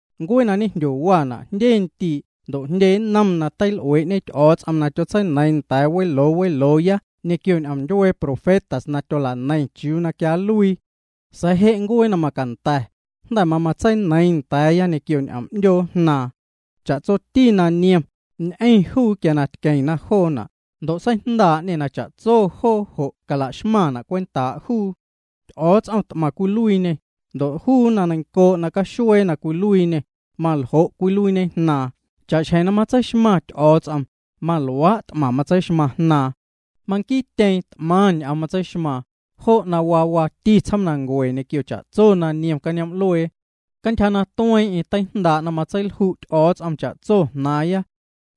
Ncuee na ñejndyowa jndye ndii' ndo' jndye nnom ñ'oom teil'uee'ñe Ty'o̱o̱ts'om na tyotseineiiⁿ nda̱a̱ weloo welooya ñequio ñ'oom ndyuee profetas na tyola'neiⁿna chiuu na quia nluii. Sa̱a̱ je' ncuee na macanda̱, jnda̱ mamatseineiiⁿ nda̱a̱ya ñequio ñ'oom 'ndyoo Jnaaⁿ. Cha'tsoti na niom, ñ'eⁿ juu quia tqueeⁿ joona', ndo' seijndaa'ñê na cha'tso joo jo' calaxmaⁿna' cwentaa' juu. Ty'o̱o̱ts'om t'maⁿ cwiluiiñê, ndo' juu na neiⁿncoo' na caxuee na cwiluiiñê, maljo' cwiluiiñe Jnaaⁿ. Cha'xjeⁿ na matseixmaⁿ Ty'o̱o̱ts'om, maluaa' t'maⁿ matseixmaⁿ Jnaaⁿ. Manquiityeeⁿ t'maⁿ ñ'oom matseixmaaⁿ, jo' na waa waati tsjoomnancue ñequio cha'tso na niom cañoom'luee. Cantyja na tueeⁿ'eⁿ teijndaa' na matseilju' Ty'o̱o̱ts'om cha'tso jnaaⁿya.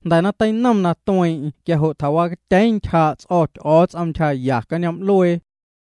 Jnda̱ na teinom na tueeⁿ'eⁿ quia jo' tjawacatyeeⁿ ntyjaa' ts'o̱ Ty'o̱o̱ts'om ntyjaya cañoom'luee.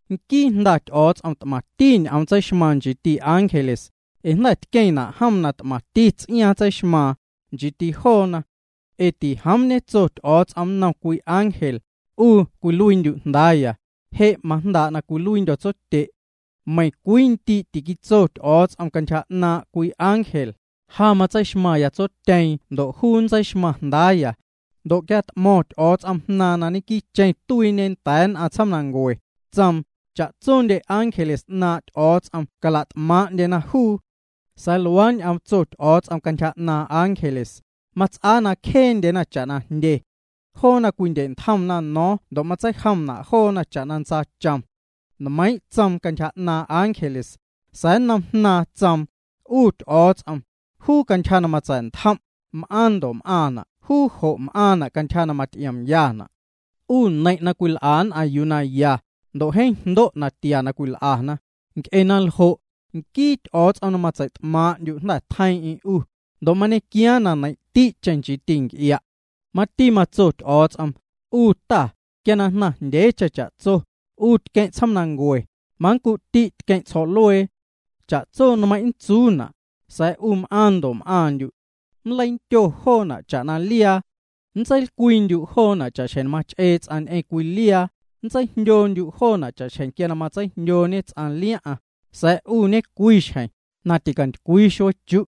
Nquii Jnda Ty'o̱o̱ts'om t'maⁿti ñ'oom tseixmaaⁿ nchiiti ángeles, ee jnda̱ tqueⁿna' jom na t'maⁿti ts'iaaⁿ tseixmaaⁿ, nchiiti joona. Ee tijoom ñetso Ty'o̱o̱ts'om nnom cwii ángel: 'U cwiluiindyu' Jndaaya; je' majndaa' na cwiluiindyo̱ tsotye'. Meiⁿ cwii ndii' tîquitso Ty'o̱o̱ts'om cantyja 'naaⁿ' cwii ángel: Ja nntseixmaⁿya tsotyeeⁿ ndo' juu nntseixmaⁿ jndaaya. Ndo' quia na t'mo̱ⁿ Ty'o̱o̱ts'om Jnaaⁿ na ñequiicheⁿ tuiiñe nda̱a̱ nn'aⁿ tsjoomnancue, tsoom: Cha'tsondye ángeles 'naaⁿ' Ty'o̱o̱ts'om cala't'maaⁿ'ndyena juu. Sa̱a̱ luaa ñ'oom tso Ty'o̱o̱ts'om cantyja 'naaⁿ ángeles: Mats'aa na cjeendyena cha'na jndye. Joona cwindye'ntjomna no̱o̱ⁿ ndo' matseijomna' joona cha'na ntsaachom. Nmeiiⁿ' tsoom cantyja 'naaⁿ' ángeles, sa̱a̱ nnom Jnaaⁿ tsoom: 'U Ty'o̱o̱ts'om, juu cantyja na matsa̱'ntjom', m'aaⁿ ndo' m'aaⁿna' juu jo' m'aaⁿna' cantyja na maty'iomyana'. 'U neiⁿ' na cwil'a nn'aⁿ yuu na ya, ndo' jeeⁿ jndo' natia na cwil'ana, Nc'e na ljo', nquii Ty'o̱o̱ts'om na matseit'maaⁿ'ndyu', jnda̱ tjeiiⁿ'eⁿ' 'U, ndo' mañequiaaⁿ na neiⁿ'ti'cheⁿ 'u, nchiiti nc'ia'. Mati matso Ty'o̱o̱ts'om: 'U Ta, quia na jnaⁿjndyeecheⁿ cha'tso, 'U tqueⁿ' tsjoomanancue; manncu'ti' tqueⁿ' ljo̱'luee. Cha'tso nmeiⁿ' nntsuuna', sa̱a̱ 'u m'aaⁿ' ndo' m'aaⁿndyu'. Nleindyo joona' cha'na liaa. Nntseilcwiindyu' joona' cha'xjeⁿ mach'ee ts'aⁿ ñ'eⁿ cwii liaa, nntseijndyoondyu' joona' cha'xjeⁿ ts'aⁿ nntseijndyooñê liaⁿ'aⁿ. Sa̱a̱ 'u ñecwiixjeⁿ: ticantycwii xuee chu'.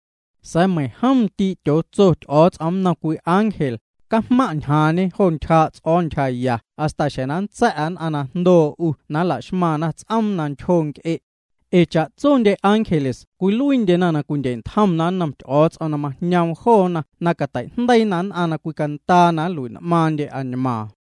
Sa̱a̱ meiⁿjom ndii' tyootso Ty'o̱o̱ts'om nnom cwii ángel: Cajmaⁿ' ñjaaⁿñe jo ntyjaa' ts'o̱o̱ ntyjaya hasta xjeⁿ na nntsa̱'a nn'aⁿ na jndoo 'u na la'xmaⁿna ts'oom na ntyjo nc'e'. Ee cha'tso ángeles cwiluiindyena na cwindye'ntjomna nnom Ty'o̱o̱ts'om na majñoom joona na cateijndeiina nn'aⁿ na cwicandaa na nlui'n'maaⁿndye añmaaⁿna.